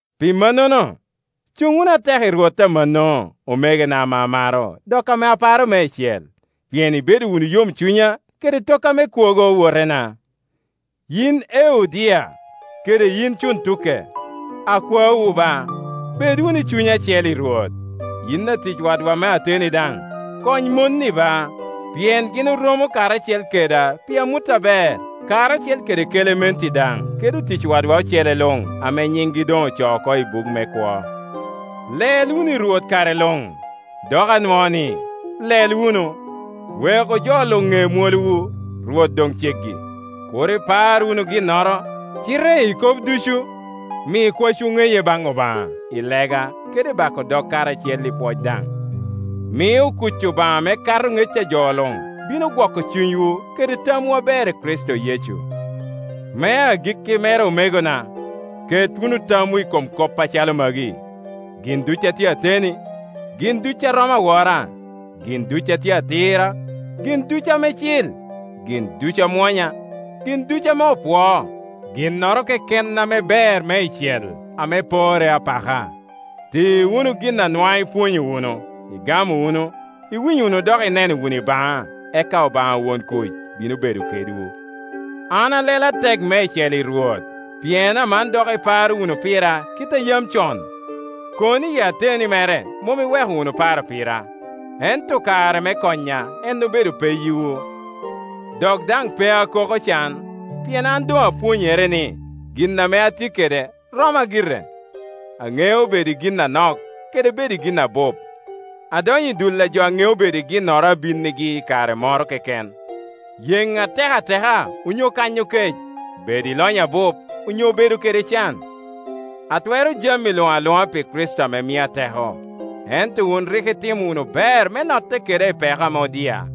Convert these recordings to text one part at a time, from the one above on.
Pi mannono, cuŋ wunu atek i Rwot amanno, omegona ame amaro dok ame aparo meicel, pien ibedo wunu yomcunya kede tokka me kwogo, owotena. Yin Eudia kede yin Cuntuke, akwaowu ba, bed wunu i cuny acel i Rwot. Yin atic wadwa me ateni daŋ, kony mon-ni ba, pien gin oromo karacel keda pi amut aber, karacel kede Kelementi daŋ kede otic wadwa ocele luŋ, ame nyiŋgi doŋ ocoo oko i buk me kwo. Lel wunu i Rwot kare luŋ. Dok anwoo ni, Lel wunu. Weku jo luŋ ŋe mwolowu. Rwot doŋ ceggi. Kur ipar wunu ginnoro, cite i kop ducu mi kwacwu ŋeye baŋ Obaŋa i lega kede i bako dog, karacel i pwoc daŋ. Mio kuc Obaŋa ame kato ŋec a jo luŋ bino gwoko cunywu kede tamwu aber i Kricito Yecu. Me agikki mere, omegona, ket wunu tamwu i kom kop acalo magi: gin ducu a tye ateni, gin ducu a romo awora, gin ducu a tye atira, gin ducu ame cil, gin ducu amwonya, gin ducu ame opwoo, ginnoro keken ame ber meicel, ame porre apaka. Ti wunu gin a nwaŋ ipwonyo wunu, igamo wunu, iwinyo wunu dok ineno wunu i baŋa: eka Obaŋa won kuc bino bedo kedwu. An alelo atek meicel i Rwot pien aman dok iparo wunu pira kit a yam con. Kono iyi ateni mere mom iweko wunu paro pira, ento kare me konya en obedo peyiwu. Dok daŋ pe akoko can, pien an doŋ apwonyere ni, gin ame atye kede roma gire. Aŋeo bedo i gin anok kede bedo i gin abup. Adonyo i dul a jo a ŋeo bedo i ginnoro a binnigi i kare moro keken, yeŋ atek ateka onyo kanyo kec, bedo i lonyo abup onyo bedo kede can. Atwero jami luŋ aluŋa pi Kricito ame mia teko. Ento wun rik itimo wunu ber me notte keda i peko ame odia.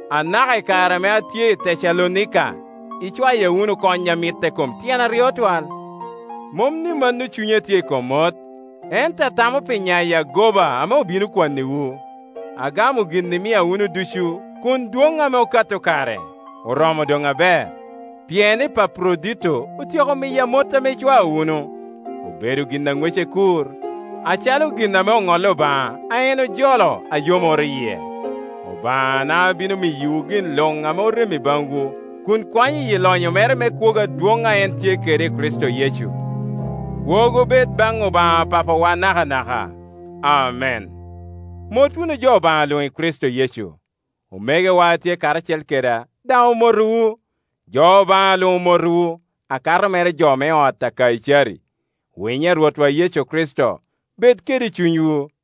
Anaka i kare ame atye i Tecalonika icwaya wunu kony a mitte kom tyen aryo twal. Mom ni mano cunya tye i kom mot, ento atamo pi nyayo agoba ame obino kwanniwu. Agamo gin imia wunu ducu, kun dwoŋ ame okato kare. Oromo doŋ aber, pien Epaprodito otyeko miya mot ame icwao wunu. Obedo gin a ŋwece kur, acalo gin ame oŋolli Obaŋa, a en ojolo, a yomoro yie. Obaŋana bino miyowu gin luŋ ame orem i baŋwu, kun kwanyo iyi lonyo mere me kwogo adwoŋ a en tye kede i Kricito Yecu. Kwogo bed baŋ Obaŋa Papawa nakanaka. Amen. Mot wunu jo Obaŋa luŋ i Kricito Yecu. Omegowa a tye karacel keda daŋ omotowu. Jo Obaŋa luŋ omotowu, akato mere jo me ot a Kaicari. Winyo a Rwotwa Yecu Kricito bed kede cunywu.